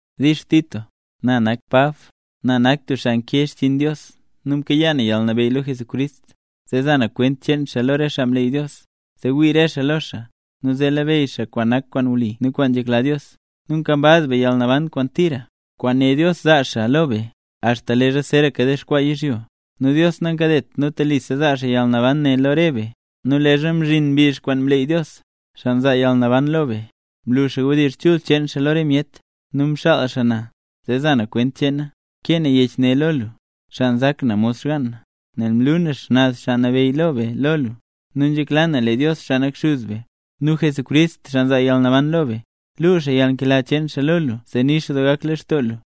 Dix Tito, Na nak Pab. Na nak tub xaa nkee xchiin Dios, nu mkayaa na yalnabeyy lo Jesucrist, zee za na kwent cheen xaa lo re xaa mleey Dios, zee wii re xaa lo xaa, nu zee labeyy xaa kwaan nak kwaan wli nu kwaan nzhekla Dios. Nu nkambaz be yalnaban kwaan tira, kwaan né Dios zaa xaa lo be, axta leezha zeeraka dexkwaa yizhyo. Nu Dios nankadet nu telisa zaa xaa yalnaban ne lo re be; nu leezha mzhin mbizh kwaan mleey Dios, xaa nzaa yalnaban lo be, mlu xaa wdizh chul cheen xaa lo re myet, nu mxaal xaa na, zee za na kwent cheena. Nkee na yech ne lo lu, xaa nzak na mod xgaan na, nel mlu na Xnaz Xaa Nabeyy be lo lu. Nu nzhekla na lee Dios, xaa nak Xuz be, nu Jesucrist, xaa nzaa yalnaban lo be, luu xaa yalnkela cheen xaa lo lu zee nix doo gak lextoo lu.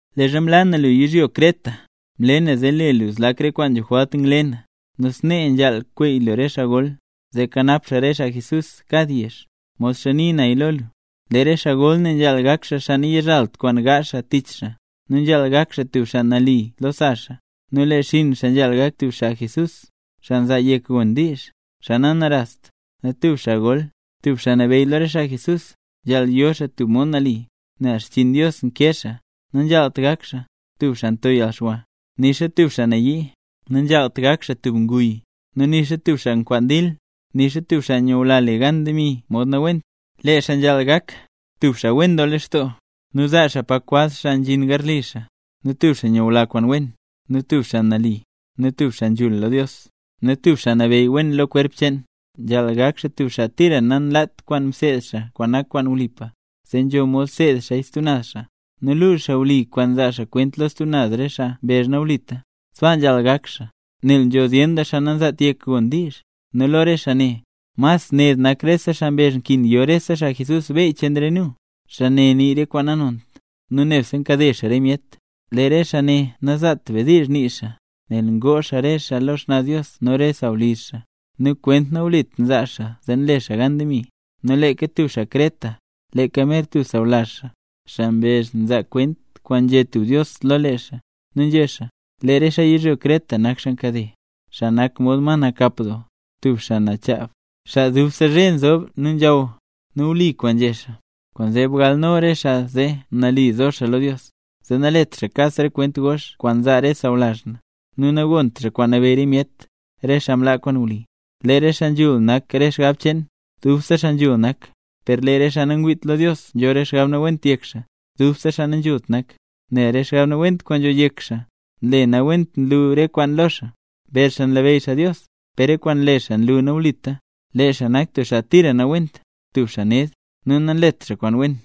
Leezha mlaa na lu yizhyo Creta, mle naya zee le lu zlak re kwaan nzho jwalt ngle na. Nu snee nzhaal kweey lu re xaa gol, zee kanap xaa re xaa Jesús kad yezh, modxa nii naya lo lu. Lee re xaa gol ne nzhaal gak xaa nayizhalt xaa kwaan gaazh xaa tich xaa. Nu nzhaal gak xaa tub xaa nali lo sa xaa, nu lee xinn xaa nzhaal gak tub xaa Jesús, xaa nzaa yek gon diizh, xaa nanarast. Nu tub xaa gol, tub xaa nabeyy lo re xaa Jesús, nzhaal yo xaa tub mod nali, nel xchiin Dios nkee xaa. Nanzhaalt gak xaa: tub xaa nto yalxwa, nixa tub xaa nayii, nanzhaalt gak xaa tub nguy, nu nixa tub xaa nkwaan dil, nixa tub xaa nyula le gan demi mod nawent. Lee xaa nzhaal gak: tub xaa wen doo lextoo, nu tub xaa zaa pa kwaz xaa nzhin garli xaa, nu tub xaa nyula kwaan wen, nu tub xaa nali, nu tub xaa nzhul lo Dios, nu tub xaa nabeyy wen lo kwerp cheen. Nzhaal gak xaa tub xaa tira nanlaat kwaan mseed xaa kwaan nak kwaan wlipa, zee nzho mod seed xaaya stub naz xaa, nu luu xaa wli kwaan nzaa xaa kwent lo stub naz re xaa mbezh nawlita. Sbaa nzhaal gak xaa, nel nzho zyen doo xaa nanzaat yek gon diizh, nu lo re xaa ne, mas ned nak re xaa mbezh nkin yo rese xaa Jesús beyy cheen re nu; xaa ne nii re kwaan nanont, nu nebse nkade xaa re myet. Lee re xaa ne nazaat be diizh nii xaa, nel ngoo xaa re xaa lo xnaz Dios nu noka re sawlizh xaa. Nu re kwent nawlit nzaa xaa zee nle xaa gan demi. Nu leeka tub xaa Creta, leeka mer tub sawlazh xaa, xaa mbezh nzaa kwent kwaan nzhé tub dios lo lee xaa, nu nzhé xaa: “Lee re xaa yizhyo Creta nak xaa nkade, xaa nak mod ma nakap doo, tub xaa nchaab, xaa dubse zhe nzob nu nzhaw”. Nu wli kwaan nzhé xaa. Kwaanzee bgalno re xaa ne zee nali zo xaa lo Dios, zee nalet xaa kas re kwent gox kwaan nzaa re xaa sawlazh na, nu nagont xaa kwaan nabeyy re myet, re xaa mlaa kwaan wli. Lee re xaa nzhul nak re xgab cheen, dubse xaa nzhul nak; per lee re xaa nangwiit lo Dios nzho re xgab nawent yek xaa, dubse xaa nanzhult nak, nel re xgab nawent kwaan nzho yek xaa, nle nawent nyun re kwaan lo xaa. Mbezh xaa nlabeyy xaa Dios, per re kwaan nle xaa nlu nawlita. Lee xaa nak tira nawent, tub xaa ned, nu nanlet kwaan wen.